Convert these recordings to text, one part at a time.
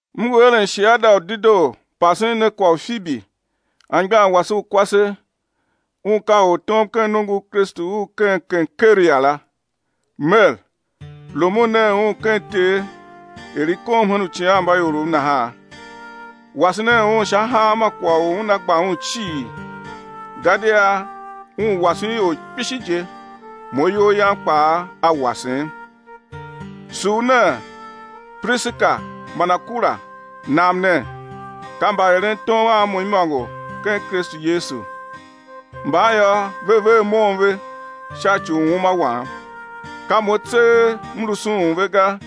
M ngu eren shiada u dedoo pasen ne kwagh u Fibi, anmgbian wase u kwase, un ka ortom ken nongo u Kristu u ken Kenkria la, mer, rumun nen un ken Ter er i kom hen uicighanmbaiorov nahan. Wase nen un sha hanma kwagh u una gba un cii, gadia un wasen ior kpishi je, mo iyol yam kpaa a wasem. Sugh nen Prishila man Akula, nam nen, ka mbaerentom a mo imôngo ken Kristu Yesu. Mban yô, ve ver mon ve sha ci u uma wam, ka mo tseegh m lu sughun ve ga,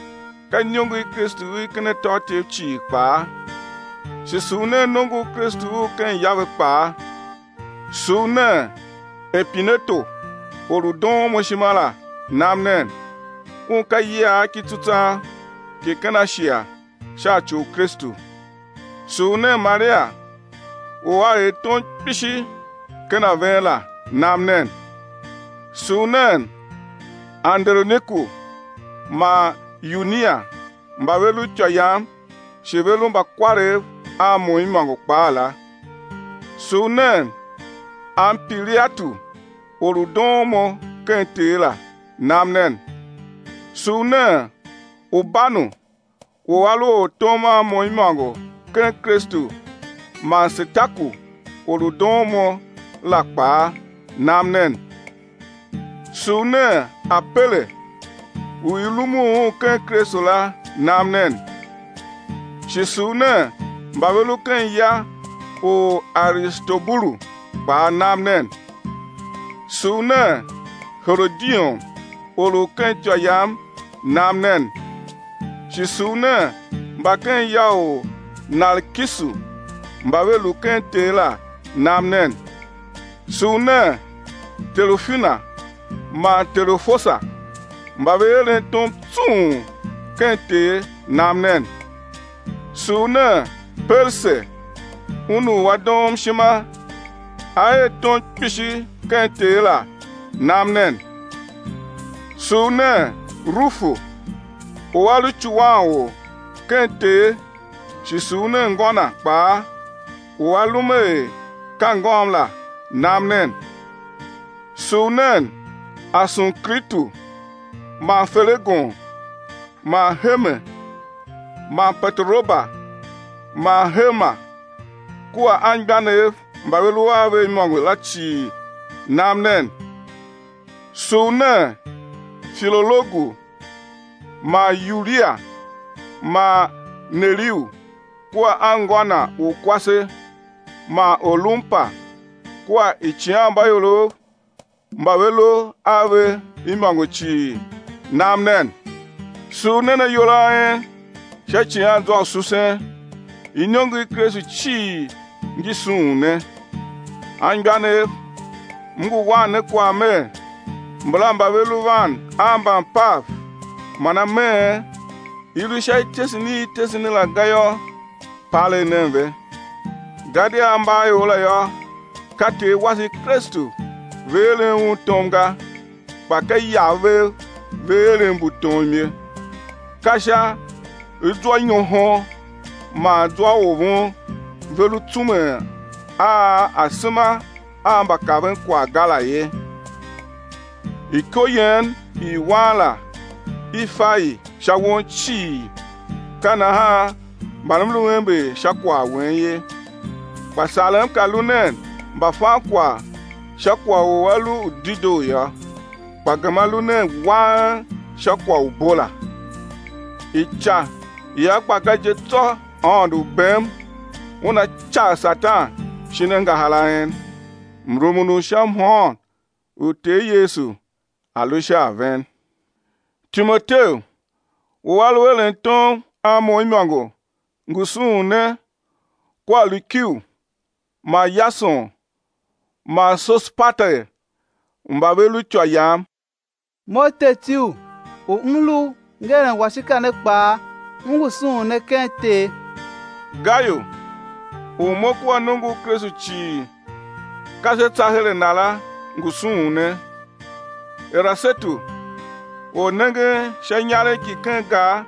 ka iniongo i Kristu i ken atôatyev cii kpaa. Shi sugh nen nongo u Kristu u ken ya ve kpaa. Sugh nen Epineto, or u doon mo ishima la nam nen. Un ka iyiagh ki tsutswagh ki ken Ashia sha ci u Kristu. Sugh nen Maria u a er tom kpishi ken a ven la nam nen. Sugh nen Anderoniku man Yunia mba ve lu ityô yam shi ve lu mbakwarev a mo imôngo kpaa la. Sugh nen Ampiliatu or u doon mo ken Ter la, nam nen. Sugh nen Urbanu u a lu ortom a mo imôngo ken Kristu man Setaku or u doon mo la kpaa, nam nen. Sugh nen Apele u i rumun un ken Kristu la nam nen. Shi sugh nen mba ve lu ken ya u Aristobulu kpaa nam nen. Sugh nen Herodion or u ken ityô yam nam nen. Shi sugh nen mba ken ya u Narkisu mba ve lu ken Ter la nam nen. Sugh nen Terufina man Terufosa mba ve eren tom tsung ken Ter nam nen. Sugh nen Perse un u a doom ishima, a er tom kpishi ken Ter la nam nen. Sugh nen Rufu u a lu icuwanor ken Ter, shi sugh nen ngô na kpaa u a lum er ka ngôm la nam nen. Sugh nen Asunkritu man Felegon man Herme man Pateroba man Herma kua anmgbianev mba ve lu a ve imôngo la cii nam nen. Sugh nen Filologu man Yulia man Neriu kua anngô na u kwase man Olumpa kua uicighanmbaiorov mba ve lu a ve imôngo cii nam nen. Sugh nen ayol a en sha icighanzwa u susen. Iniongo i Kristu cii ngi sughun ne. Anmgbianev, m ngu wan ne kwagh mer, mbala mba ve lu van a mbampav man ameen, i lu sha ityesen i i tese ne la ga yô, palegh nen ve. Gadia ambaaior la yô, ka Ter wase Kristu ve eren Un tom ga kpa ka iyav vev ve eren mbu tom ye. Ka sha zwanyohon man zwaovon ve lu tsumen a asema a mbakavenkwagh ga la ye. Iko yen i wan la i fa i sha won cii, ka nahan man m lu ember sha kwagh wen ye. Kpa sarem ka lu nen mbafankwagh sha kwagh u a lu u dedoo yô, kpa gema lu nen wang sha kwagh u bo la. Ica ia gba ga je tsô Aôndo u bem Una cagh Satan shin angahar a en. Mrumun u sha mhôôn u Ter Yesu a̱ lu sha a ven. Timoteu u a lu eren tom a mo imôngo ngu sughun ne kua Lukiu man Yason man Sosipater mba ve lu ityô yam. Mo Tertiu u m lu ngeren washika ne kpaa, m ngu sughun ne ken Ter. Gayu u mo kua nongo u Kristu cii ka se tsa her a na la ngu sughun ne. Erasetu ornengen sha inyaregh ki ken gar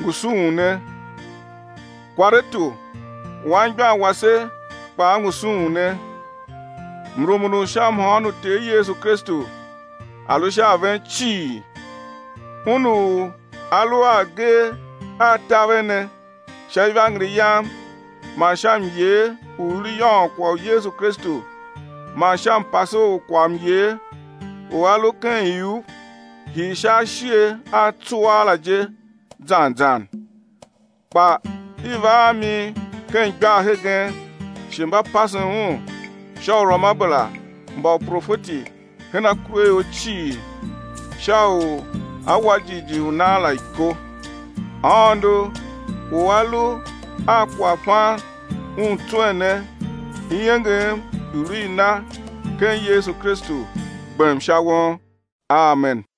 ngu sughun ne. Kwaretu anmgbian wase kpaa ngu sughun ne. [ Mrumun u sha mhôôn u Ter Yesu Kristu a̱ lu sha ven cii.] Un u A lu a agee a̱ taver ne sha ivangeli yam man sha myee u i lu yôôn kwagh u Yesu Kristu man sha mpase u kwaghmyer u a lu ken iuv hii sha ashighe a tsuaa la je zan zan. Kpa i va a mi ken igbar hegen shi mba pasen un sha uruamabera mba uprofeti hen akuraior cii, sha u a̱ wa jighjigh u nan la iko— Aôndo u A lu a kwaghfan Un tswen ne, iengem i̱ lu i Na ken Yesu Kristu gbem sha won. Amen.